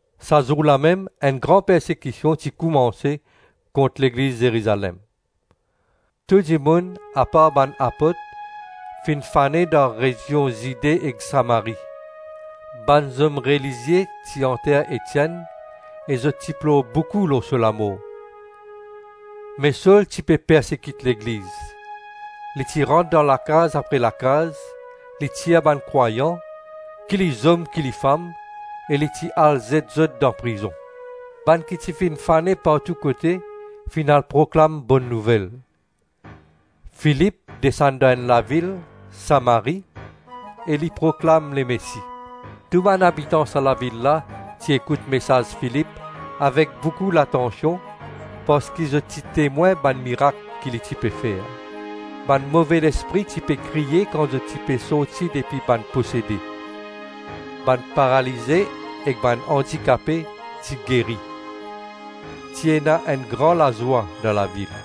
Sa zour lamem enn gran persekision ti koumanse kont legliz Zerizalem. Tou dimoun, apart bann apot, finn fane dan rezion Zide ek Samari. Bann zom relizie ti anter Etienn e zot ti plor boukou lor so lamor. Me Sol ti pe persekit legliz; li ti rant dan lakaz apre lakaz, li tir bann krwayan - ki li zom ki li fam - e li ti al zet zot dan prizon. Filip proklam laparol dan Samari. Bann ki ti finn fane partou kote, finn al proklam Bonn Nouvel. Filip desann dan enn lavil Samari e li proklam Lemesi. Tou bann abitan sa lavil la ti ekout mesaz Filip avek boukou latansion parski zot ti temwin bann mirak ki li ti pe fer. Bann move lespri ti pe kriye kan zot ti pe sorti depi bann posede, bann paralize ek bann andikape ti geri. Ti ena enn gran lazwa dan lavil.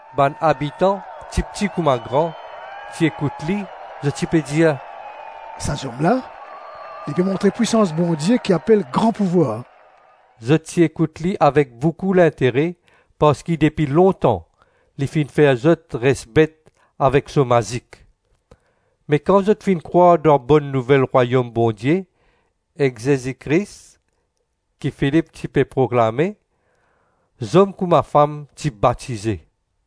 Bann abitan, tipti kouma gran, ti ekout li, zot ti pe dir, “Sa zom la, li pe montre pwisans Bondie ki apel ‘Gran pouvwar.’” Zot ti ekout li avek boukou lintere parski depi lontan li finn fer zot res bet avek so mazik. Me kan zot finn krwar dan Bonn Nouvel rwayom Bondie ek Zezi Kris ki Filip ti pe proklame, zom kouma fam, ti batize.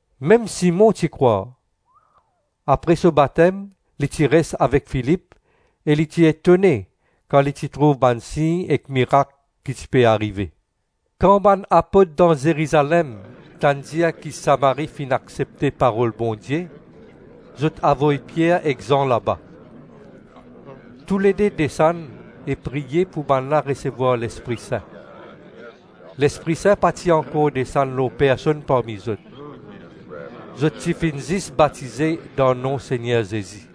Mem Simon ti krwar. Apre so batem li ti res avek Filip e li ti etone kan li ti trouv bann sign ek mirak ki ti pe arive. Kan bann apot dan Zerizalem tann dir ki Samari finn aksepte parol Bondie, zot avoy Pier ek Zan laba. Toulede desann e priye pou bannla resevwar Lespri Sin. Lespri Sin pa ti ankor desann lor personn parmi zot; zot ti finn zis batize dan nom Segner Zezi.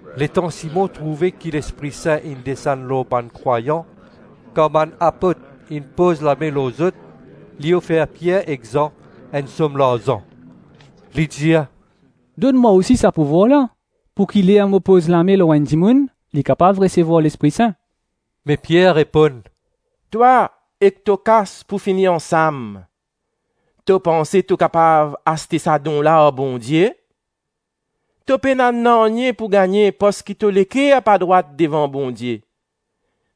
Letan Simon trouve ki Lespri Sin inn desann lor bann krwayan kan bann apot inn poz lame lor zot, li ofer Pier ek Zan enn som larzan. Li dir, “Donn mwa osi sa pouvwar la, pouki ler mo poz lame lor enn dimoun, li kapav resevwar Lespri Sin.” Me Pier reponn, “Twa ek to kas pou fini ansam! To panse to kapav aste sa don la ar Bondie? To pena nanye pou gagne parski to leker pa drwat devan Bondie.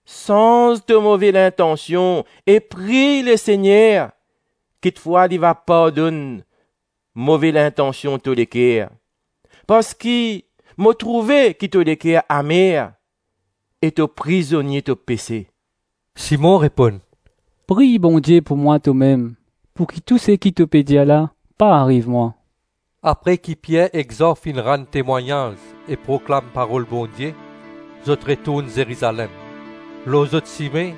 Sanz to move lintansion e priy Lesegner; kikfwa li va pardonn move lintansion to leker. Parski mo trouve ki to leker amer e to prizonie to pese.” Simon reponn, “Priy Bondie pou mwa tomem pouki tou seki to pe dir la pa ariv mwa.” Apre ki Pier ek Zan finn rann temwagnaz e proklam parol Bondie, zot retourn Zerizalem. Lor zot sime,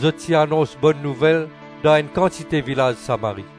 zot ti anons Bonn Nouvel dan enn kantite vilaz Samari.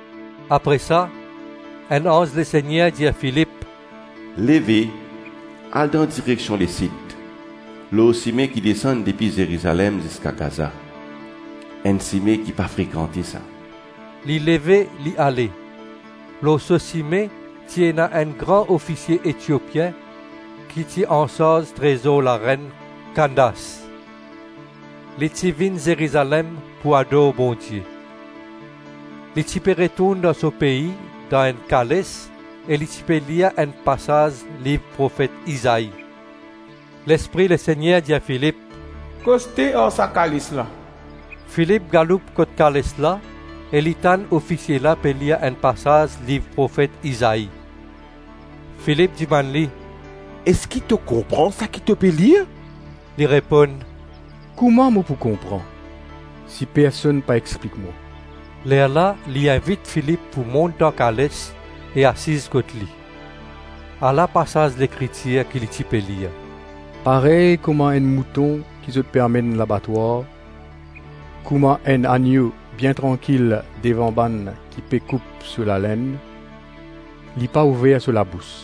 Apre sa, enn anz Lesegner dir Filip, “Leve, al dan direksion lesid, lor sime ki desann depi Zerizalem ziska Gaza. Enn sime ki pa frekante sa.” Li leve, li ale. Lor so sime ti ena enn gran ofisie Etiopien ki ti ansarz trezor larenn Kandas; li ti vinn Zerizalem pou ador Bondie. Li ti pe retourn dan so pei dan enn kales, e li ti pe lir enn pasaz liv profet Izai. Lespri Lesegner dir Filip, “Koste ar sa kales la.” Filip galoup kot kales la e li tann ofisie la pe lir enn pasaz liv profet Izai. Filip dimann li, “Eski to konpran saki to pe lir?” Li reponn, “Kouma mo pou konpran, si personn pa explik mwa?” Lerla li invit Filip pou mont dan kales e asiz kot li. Ala pasaz Lekritir ki li ti pe lir: “Parey kouma enn mouton ki zot pe amenn labatwar kouma enn annyo bien trankil devan bann ki pe koup so lalenn, li pa ouver so labous.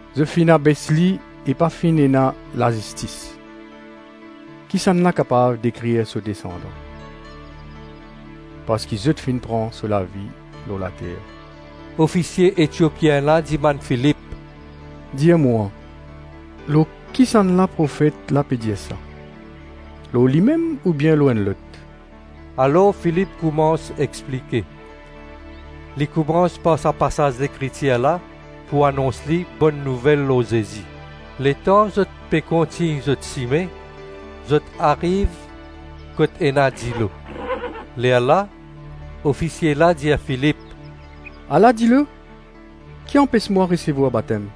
Zot finn abes li e pa finn ena lazistis; kisannla kapav dekrir so desandan? Parski zot finn pran so lavi lor later.” Ofisie Etiopien la dimann Filip, “Dir mwa, lor kisannla profet la pe dir sa, lor limem oubien lor enn lot?” Alors Filip koumans explike. Li koumans par sa pasaz Lekritir la pou anons li Bonn Nouvel lor Zezi. Letan zot pe kontign zot sime, zot ariv kot ena dilo; lerla ofisie la dir Filip, “Ala dilo, ki anpes mwa resevwar batem?” [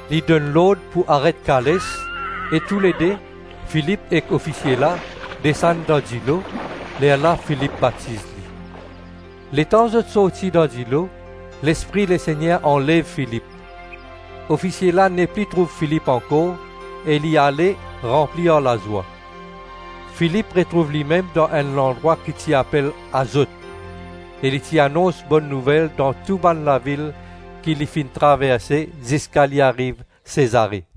Li donn lord pou aret kales, e toulede, Filip ek ofisie la, desann dan dilo, lerla Filip batiz li. Letan zot sorti dan dilo, Lespri Lesegner anlev Filip; ofisie la nepli trouv Filip ankor, e li ale ranpli ar lazwa. Filip retrouv limem dan enn landrwa ki ti apel Azot, e li ti anons Bonn Nouvel dan tou bann lavil ki li finn traverse ziska li ariv Sezare.